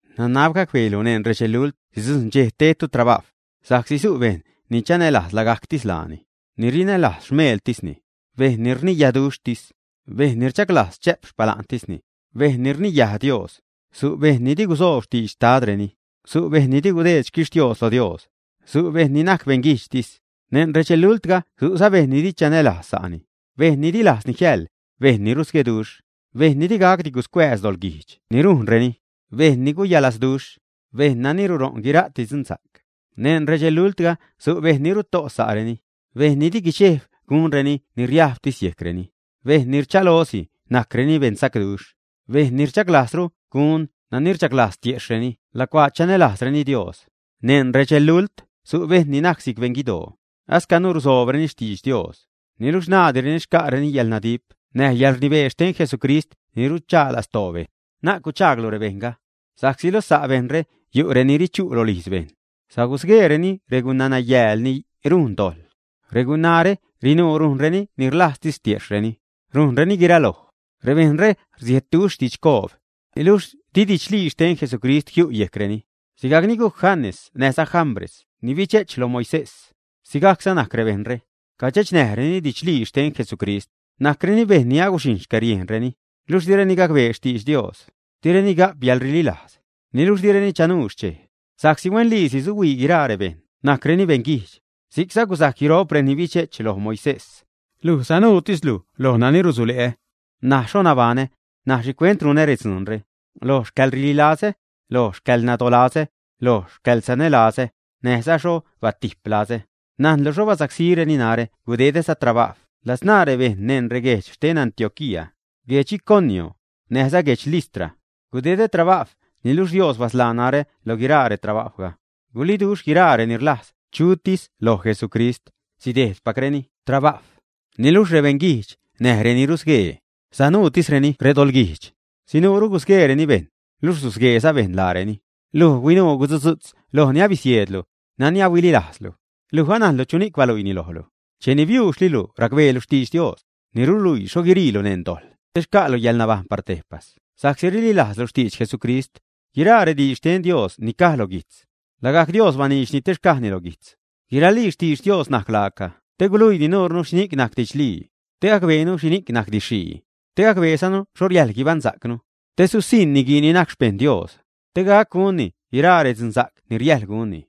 Nanab gacbeelu neṉ redxelult sidzujṉ dxej tedtu trabajw. Sa'csi su' bejṉ ni chanälajz lagajctis laani, ni rinälajz xmeeltisni, bejṉ ni rniyaduxhtis, bejṉ ni rchaglajz chä'p xpala'ntisni, bejṉ ni rniyaj Dios; su' bejṉ ni di gusoob xtidx xtadreni, su' bejṉ ni di gudeed xquixtios lo Dios, su' bejṉ ni najc beṉguijdxtis. Neṉ redxelultga su'za bejṉ ni di chanälajz sa'ni, bejṉ ni di lajzni jiäjḻ, bejṉ ni rusgueduxh; bejṉ ni digacdi guscuääz doḻguijdx ni rujnreni; bejṉ ni guyalazduxh; bejṉ nani ruṟo'n guira'ti dzunsa'c. Neṉ redxelultga su' bejṉ ni ruto' sa'reni; bejṉ ni di guidxejb gunreni ni riajbtis yejcreni, bejṉ ni rchalosi najcreni beṉsacduxh; bejṉ ni rchaglajzru gun nani rchaglajz tiejxhreni lacuaa chanälajzreni Dios. Neṉ redxelult su' bejṉ ni najc si'c beṉguidoo, ascanu rusoobreni xtidx Dios, niluxh naadireni xca'reni yäḻnadip näj yäḻrnibee xten Jesucrist ni ruchaa lastoo bejṉ. Na'c guchaaglu rebejṉga, sa'csi loj sa' bejṉre yu' reni richu' rolijz bejṉ, sasgueereni regunanayääl ni rujn dojḻ. Regunaare rinuu rujreni ni rlajztis tiejxhreni, rujnreni guiraloj. Rebejṉre rsiedduxh didxcoob, niluxh di didxlii xten Jesucrist jiu' yejcreni. Sigajcni gujc Janes näjza Jambres ni bidxe'ch loj Moisés, sigajcza najc rebejṉre, cadxechnäjreni didxlii xten Jesucrist, najcreni bejṉ ni aguxhijṉ xcäriejnreni, luxh direni gacbee xtidx Dios, direni ga'p yäḻrililajz. Niluxh direni chanuu xchej, sa'csi huenliisi suhuii guiraa rebejṉ najcreni beṉguijdx. Si'cza gusajc guiro'p reni bidxe'ch loj Moisés. Luj sanuutislu lo nani rusule'ä, näj xho nabaṉä, näj xhicuent runä dzuunre, lo xcäḻrililazä, lo xcäḻnadolazä, lo xcäḻsanälazä, näjza xho batip lazä. Najnlu xho basacsíreni narä gudedäza trabajw ladzṉaa rebejṉ neṉ reguejdx xten Antioquía, guedx Iconio, näjza guedx Listra. Gudedä trabajw niluxh Dios basḻaa narä loj guiraa retrabajwga. Guliduxh guiraa reni rlajz chutis loj Jesucrist sidejdpacreni trabajw. Niluxh rebeṉguijdx näj reni rusguee, sinuutisreni redoḻguijdx, sinuuru gusgueereni bejṉ, luxh susgueeza bejṉ laareni. Luj huinuu guzudzu'tz loj ni abisieedlu, nani ahuililajzzalu, luj anajnlu chuni'c baluiini lojlu. Cheni biuuxlilu racbeelu xtidx Dios, ni ruluiilu xho guiriilu neṉ dojḻ te xca'lu yäḻnabajṉ par tejpas sa'csi rililajzlu xtidx Jesucrist. Guiraa rediidx xten Dios ni caj lo guijtz, lagajc Dios baniidxni te xcajni lo guijtz. Guiralii xtidx Dios najc laaca te guluii nuurnu xhini'c najc didxlii, te gacbeenu xhi najc didx-xhii, te gacbeezanu xho riäjḻ guibaṉsa'cnu. Te susiṉ niguii ni najc xpejṉ Dios, te gac gunni guiraa redzunsa'c ni riäjḻ gunni.